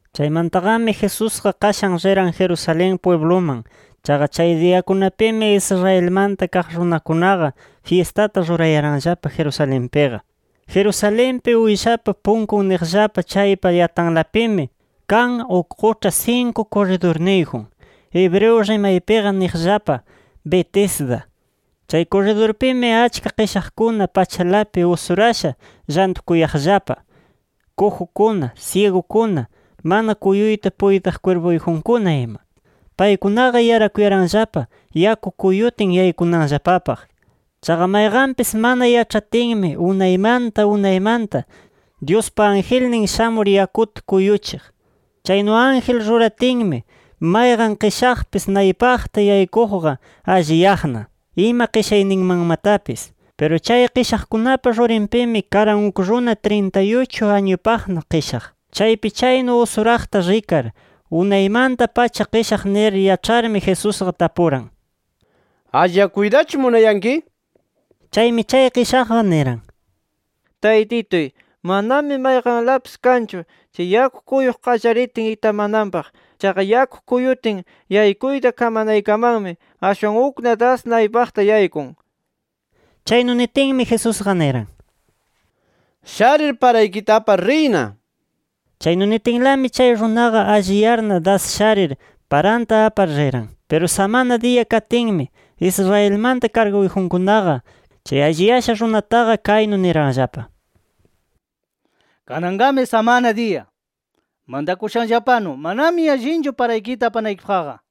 Chaymantaqami Jesusqa qashan riran Jerusalén pwibluman. Chaqa chay diyakunapimi Israelmanta kaq runakunaqa fyistata rurayaranllapa Jerusalenpiqa. Jerusalenpi, Uyshapa Punkun niqllapa chaypa yatanlapimi kan uk quĉha sinku kurridurniyjun. Hebreo rimaypiqa niqllapa Betesda. Chay kurridurpimi, achka qishaqkuna pachalapi usurasha llantukuyaqllapa, kujukuna, syigukuna, mana kuyuyta puytiq kwirpuyjunkuna ima. [Paykunaqa yarakuyaranllapa yaku kuyutin, yaykunanllapapaq. Chaqa mayqanpis mana yaĉhatinmi unaymanta unaymanta, Dyuspa angelnin shamur yakuta kuyuchiq. Chaynu ángel ruratinmi, mayqan qishaqpis naypaqta yaykuqqa alliyaqna, ima qishayninmanmatapis.] Piru chay qishaqkunapa rurinpimi, karan uk runa trintay-uchu añupaqna qishaq. Chaypi chaynu usuraqta rikar, unaymanta-pacha qishaq nir yaĉharmi, Jesusqa tapuran: —¿Alliyakuytachu munayanki? nir. Chaymi chay qishaqqa niran: —Taytituy, manami mayqanlapis kanchu chay yaku kuyuq qallaritin itamananpaq. Chaqa yaku kuyutin, yaykuyta kamanaykamanmi ashwan ukna das naypaqta yaykun. Chaynu nitinmi, Jesusqa niran: —Sharir, paraykita apar riyna nir. Chaynu nitinlami, chay runaqa alliyarna das sharir, paranta apar riran. Piru samana diya katinmi, Israelmanta karguyjunkunaqa, chay alliyasha runataqa kaynu niranllapa: —Kananqami samana diya. Mantakushanllapanu, manami allinchu paraykita apanaykipaqqa.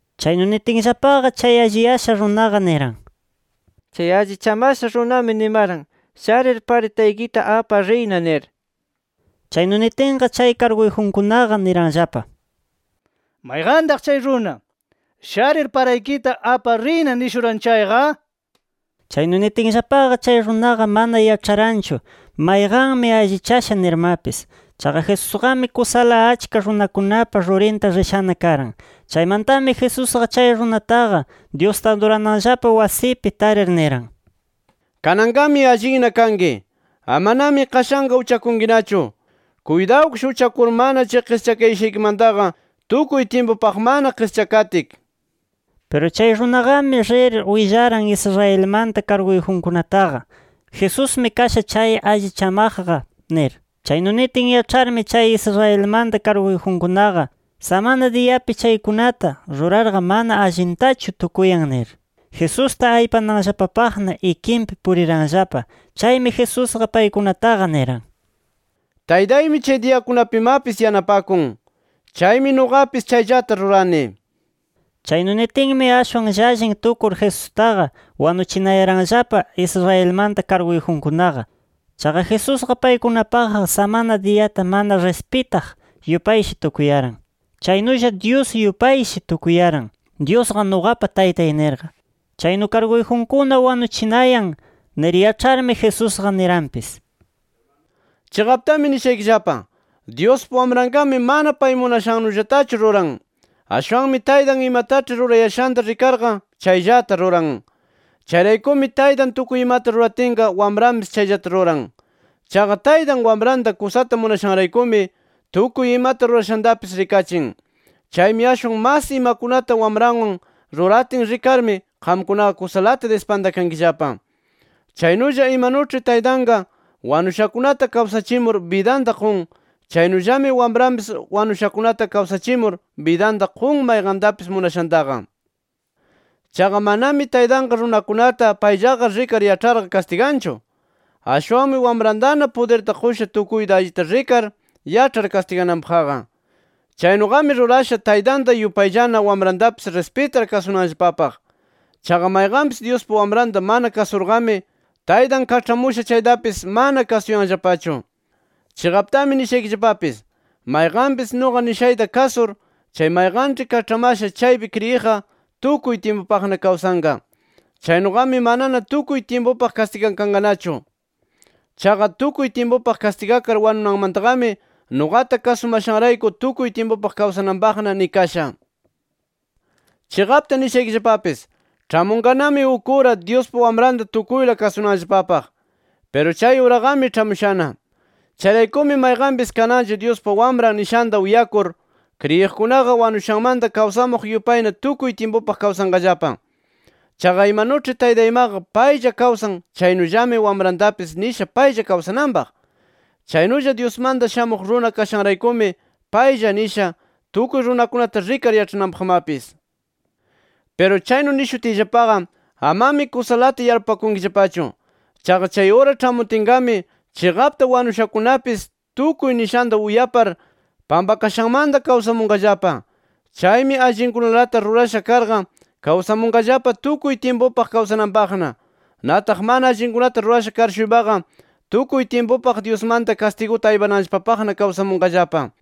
Chaynu nitinllapaqa, chay alliyasha runaqa niran: —Chay allichamasha runami nimaran: ‘Sharir, paraykita apar riyna’ nir. Chaynu nitinqa, chay karguyjunkunaqa niranllapa: —¿Mayqantaq chay runa ‘Sharir paraykita apar riyna’ nishuran chayqa? Chaynu nitinllapaqa, chay runaqa mana yaĉharanchu, mayqanmi allichasha nirmapis. Chaqa Jesusqami, kusala achka runakunapa rurinta rishana karan. Chaymantami Jesusqa chay runataqa, Dyusta adurananllapa wasipi tarir, niran: —Kananqami allinna kanki. Amanami qashanqa uchakunkinachu. Kuytawkish uchakurmana chay qischakayashaykimantaqa tukuy tyimpupaqmana qischakatki nir. Piru chay runaqami rir willaran Israelmanta karguyjunkunataqa, “Jesusmi kasha chay allichamaqqa” nir. Chaynu nitin yaĉharmi chay Israelmanta karguyjunkunaqa, samana diyapi chaykunata rurarqa mana allintachu tukuyan nir, Jesusta aypananllapapaqna ikinpi puriranllapa. Chaymi Jesusqa, paykunataqa niran: —Taytaymi chay diyakunapimapis yanapakun. Chaymi nuqapis chayllata rurani. Chaynu nitinmi, ashwan llallin tukur Jesustaqa wanuchinayaranllapa Israelmanta karguyjunkunaqa. Chaqa Jesusqa paykunapaqqa samana diyata mana rispitaq yupayshi tukuyaran. Chaynulla Dyus yupayshi tukuyaran, “Dyusqa nuqapa Taytay” nirqa. Chaynu karguyjunkuna wanuchinayan nir yaĉharmi, Jesusqa niranpis: “Chiqaptami nishaykillapa: Dyuspa Wamranqami mana pay munashannullatachu ruran. Ashwanmi Taytan imataĉhi rurayashanta rikarqa, chayllata ruran. Chayraykumi Taytan tukuy imata ruratinqa Wamranpis chayllata ruran. Chaqa Taytan Wamranta kusata munashanraykumi, tukuy imata rurashantapis rikachin. Chaymi ashwan mas imakunata Wamranwan ruratin rikarmi, qamkunaqa kusalata dispantakankillapa. Chaynulla imanuĉhi Taytanqa, wanushakunata kawsachimur bidanta qun, chaynullami Wamranpis wanushakunata kawsachimur bidanta qun mayqantapis munashantaqa. Chaqa manami Taytanqa runakunata payllaqa rikar yaĉharqa kastiganchu. Ashwanmi Wamrantana pudirta qusha tukuyta allita rikar yaĉhar kastigananpaqqa. Chaynuqami rurasha Taytanta yupayllana Wamrantapis rispitar kasunanllapapaq. Chaqa mayqanpis Dyuspa Wamranta mana kasurqami, Taytan kaĉhamusha chaytapis mana kasuyanllapachu. “Chiqaptami nishaykillapapis: Mayqanpis nuqa nishayta kasur, chay mayqanĉhi kaĉhamasha chaypi kriyiqqa, tukuy tyimpupaqna kawsanqa. Chaynuqami manana tukuy tyimpupaq kastigakanqanachu. Chaqa tukuy tyimpupaq kastigakar wanunanmantaqami, nuqata kasumashanrayku, tukuy tyimpupaq kawsananpaq nikasha. Chiqapta nishaykillapapis: Ĉhamunqanami uk ura, Dyuspa Wamranta tukuyla kasunanllapapaq. Piru chay uraqami ĉhamushana. Chayraykumi mayqanpis kananlla Dyuspa Wamran nishanta uyakur, kriyiqkunaqa wanushanmanta kawsamuq yupayna tukuy tyimpupaq kawsanqallapa. Chaqa imanuĉhi Taytanmaqa paylla kawsan chaynullami Wamrantapis nisha paylla kawsananpaq. Chaynulla Dyusmanta Shamuq Runa kashanraykumi, paylla nisha tukuy runakunata rikar yaĉhananpaqmapis. “Piru chaynu nishutiyllapaqa amami kusalata yarpupakunkillapachu. Chaqa chay ura ĉhamutinqami, chiqapta wanushakunapis tukuy nishanta uyapar, pampakashanmanta kawsamunqallapa. Chaymi allinkunalata rurasha karqa, kawsamunqallapa tukuy tyimpupaq kawsananpaqna. Nataq mana allinkunata rurasha kar-shuypaqa tukuy tyimpupaq Dyusmanta kastiguta aypananllapapaqna kawsamunqallapa”.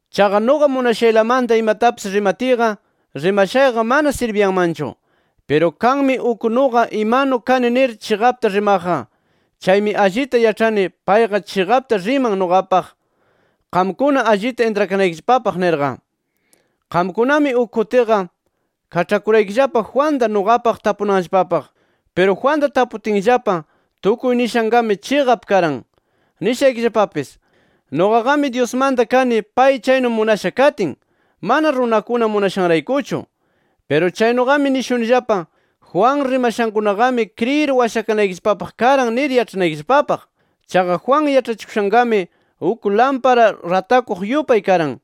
Chaqa nuqa munashaylamanta imatapis rimatiyqa, rimashayqa mana sirbiyanmanchu. Piru kanmi uk, nuqa imanu kani nir chiqapta rimaqqa. Chaymi allita yaĉhani, payqa chiqapta riman nuqapaq, qamkuna allita intrakanaykillapapaq nirqa. “Qamkunami uk kutiqa kaĉhakuraykillapa Juanta, nuqapaq tapunanllapapaq. Piru Juanta taputinllapa tukuy nishanqami chiqap karan. Nishaykillapapis: Nuqaqami Dyusmanta kani pay chaynu munasha katin, mana runakuna munashanraykuchu. Piru chaynuqami nishunillapa: Juan rimashankunaqami kriyir washakanaykillapapaq karan nir yaĉhanaykillapapaq. Chaqa Juan yaĉhachikushanqami uk lampara ratakuq yupay karan.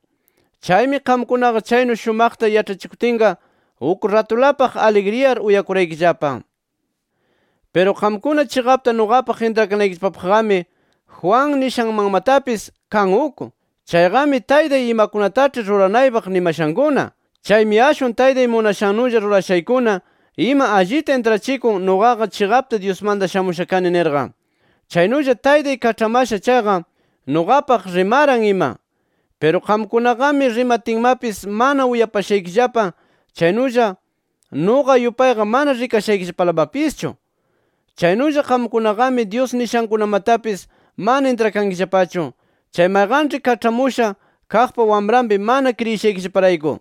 Chaymi, qamkunaqa chaynu shumaqta yaĉhachikutinqa, uk ratulapaq aligriyar uyakuraykillapa. “Piru qamkuna chiqapta nuqapaq intrakanaykillapapaqqami, Juan nishanmanmatapis kan uk. Chayqami Taytay imakunataĉhi ruranaypaq nimashankuna. Chaymi ashwan Taytay munashannulla rurashaykuna ima allita intrachikun, nuqaqa chiqapta Dyusmanta shamusha kani nirqa. Chaynulla Taytay kaĉhamasha chayqa nuqapaq rimaran ima. Piru qamkunaqami rimatinmapis mana uyapashaykillapa chaynulla nuqa yupayqa mana rikashaykillapalamapischu. Chaynulla qamkunaqami Dyus nishankunamatapis mana intrakankillapachu, chay mayqanĉhi kaĉhamusha kaqpa Wamranpi mana kriyishaykillaparayku.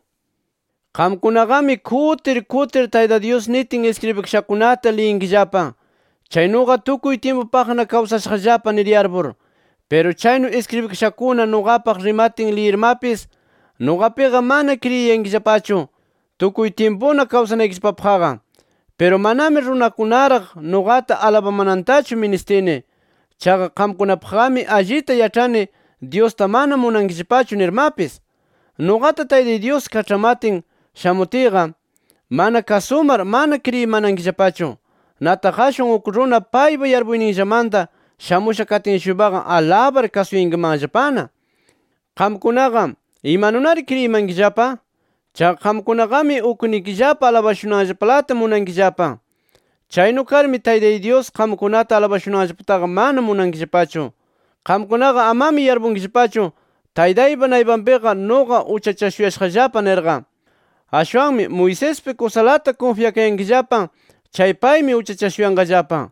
“Qamkunaqami, kutir kutir Tayta Dyus nitin iskribikashankunata liyinkillapa, chaynuqa tukuy tyimpupaqna kawsashaqllapa nir yarpur. Piru chaynu iskribikashakuna nuqapaq rimatin liyirmapis, nuqapiqa mana kriyinayankillapachu, tukuy tyimpuna kawsanaykillapapaqqa. “Piru, manami runakunaraq nuqata alabamanantachu ministini. Chaqa, qamkunapaqqami allita yaĉhani, Dyusta mana munankillapachu nirmapis. Nuqata Taytay Dyus kaĉhamatin shamutiyqa, mana kasumar mana kriyimanankillapachu. Nataq ashwan uk runa paypa yarpuyninllamanta shamusha katin-shuypaqa alabar kasuyankimanllapana. Qamkunaqa, ¿imanunari kriyimankillapa? Chaqa qamkunaqami uknikillapa alabashunanllapalata munankillapa. Chaynu karmi Taytay Dyus qamkunata alabashunanllapataqa mana munankillapachu. “Qamkunaqa amami yarpunkillapachu Taytaypa naypanpiqa nuqa uchachashuyashaqllapa nirqa. Ashwanmi Moisespi, kusalata kunfyakayankillapa chay paymi uchachashuyanqallapa.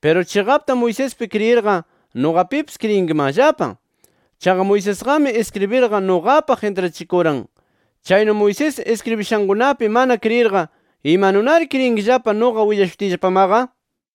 Piru chiqapta Moisespi kriyirqa, nuqapipis kriyinkimanllapa. Chaqa Moisesqami iskribirqa nuqapaq intrachikuran. Chaynu Moisés iskribishankunapi mana kriyirqa, ¿imanunari kriyinkillapa nuqa willashutiyllapamaqa?” nir.